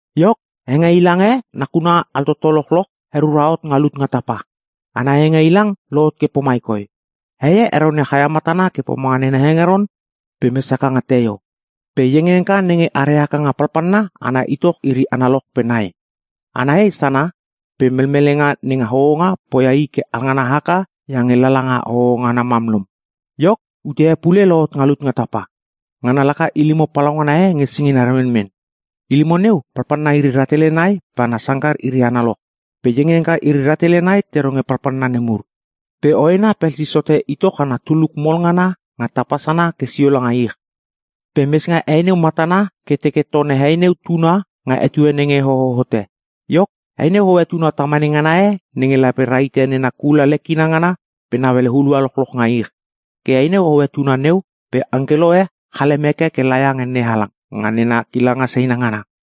Iok, hengeilang e nge nakuna altoto lochloch herura hot nga lut nga tapa. Ana hengeilang lohot ke pomai koi: Hei e heronia chaia matana ke pomanga nena hengeron pe mes haka nga teio. Pe iengiengka nenge are haka nga palpalna ana itoch iri analoch pe nai. Ana hei sana pe melmelenga nenga hohonga poia i ke alngana haka iange lala nga hoho ngana mam lom. Iok, ute e pule lohot nga lut nga tapa. Ngana laka ilimo palaungana e nge singina remenmen. Ilimo neu palpalna iri rahtele nai pe ana sangkar iri analoch. Pe iengiengka iri rahtele nai te ronge palpalna nemur. Pe hoena pelsis hote itoch ana tuluk mol ngana nga tapa sana ke sio langa ich. Pe mes nga hei neu matana ke teke tone hei neu tuna nga etue nenge hoho hote. Iok, hei neu hoe tuna tamane ngana e nenge lape rahite nena kula lekina ngana pe nauele hulua lochloch nga ich. Ke hei neu hoe tuna neu pe angkelo e chalem heke ke laia nge NeHalang nga nena kilanga seina ngana.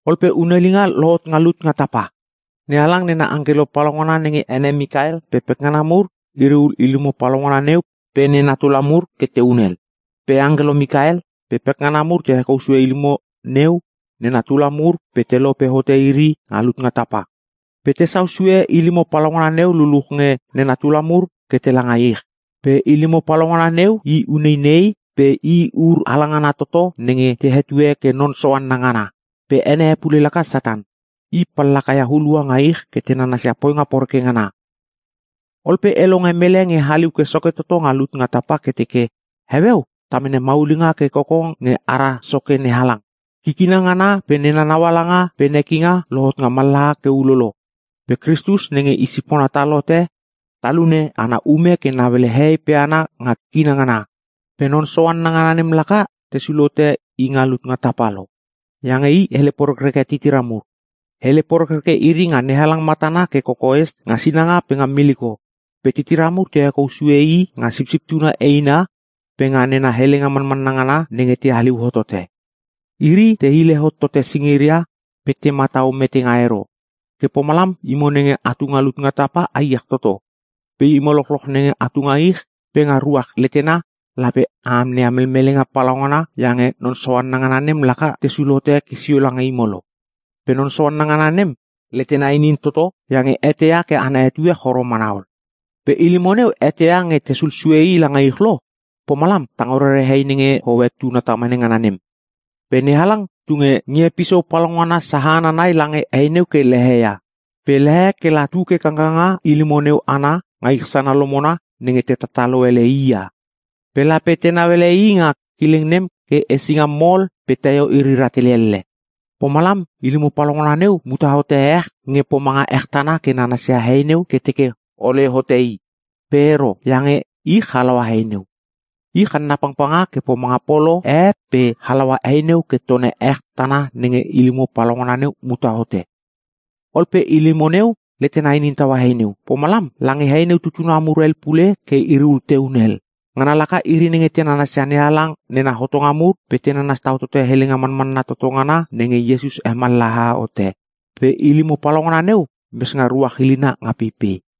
Ol pe hunelinga lohot nga lut nga tapa. NeHalang nena angkelo palaungana nenge ene Mikael pe pekngana mur, iriul ilimo palaungana neu pe nena tula mur ke te hunel. Pe angkelo Mikael pe pekngana mur te hekou sue ilimo neu pe nena tula mur pe te lope hote iri nga lut nga tapa. Pe tesau sue ilimo palaungana neu luluch nge nena tula mur ke tela nga ich. Pe ilimo palaungana neu i uneinei pe i ur halangana toto nenge te hetue ke non soanna ngana. Pe ene e pule laka Satan. I pallaka ia hulua nga ich ke te nanasia poinga poreke ngana. Ol pe e longe mele nge haliu ke soke toto nga lut nga tapa ke teke, “Heueu ta mene maulinga ke koko nge ara Soke NeHalang. Kikina ngana pe nena naualanga pe nekinga lohot nga mallaha ke ulolo. Pe Kristus nenge i sipona tal hote, Talune ana ume ke nauele hehei pe hana nga kikina ngana. Pe non soanna ngana nem laka tesul hote i nga lut nga tapa lo, iange i hele porekreke titira mur. Hele porekreke iri nga NeHalang matana ke kokoes nga sinanga pe nga miliko. Pe titira mur te hekou sue i nga Sipsip Tuna eina, pe nga nena helenga manmanna ngana nenge te haliu hottote. Iri te hile hot tote singiria pe te matau metenga ero. Ke pomalam imo nenge atu nga lut nga tapa a iech toto. Pe imo lochloch nenge atu nga ich pe nga ruach letena lape a amneia melmelenga palaungana iange non soanna ngana nem laka tesul hote ke sio lange imo lo! Pe non soanna ngana nem letena inin toto iange eteia ke ana etue choro mana ol.” Pe ilimo neu eteia nge tesul sue i langa ich lo, pomalam tango rere hei nenge hoe tuna tamane ngana nem. Pe NeHalang tunge ngie pisou palaungana sahana nai lange hei neu ke leheia. Pe lehe kela tu ke kangkanga ilimo neu ana nga ich sana lomona nenge te tatalo ele i ia. Pe lape tenau ele i nga kileng nem ke hesinga mol pe teio iri rahtele elle. Pomalam ilimo palaungana neu muta hote ech nge pomanga ech tana ke nanasia hei neu ke teke hole hote i. Pe ero, iange ich halaua hei neu. Ich hanna pangpanga ke pomanga polo e pe halaua hei neu ke tone ech tana nenge ilimo palaungana neu muta hote. Ol pe ilimo neu letena inin taua hei neu. Pomalam lange hei neu tutuna mur hel pule ke iriul te hunel. Ngana laka iri nenge te nanasia NeHalang nena hotonga mur pe te nanas tau tote helenga manmanna toto ngana nenge Iesus hemallaha hote. Pe ilimo palaungana neu mes nga ruach ilina nga peipei.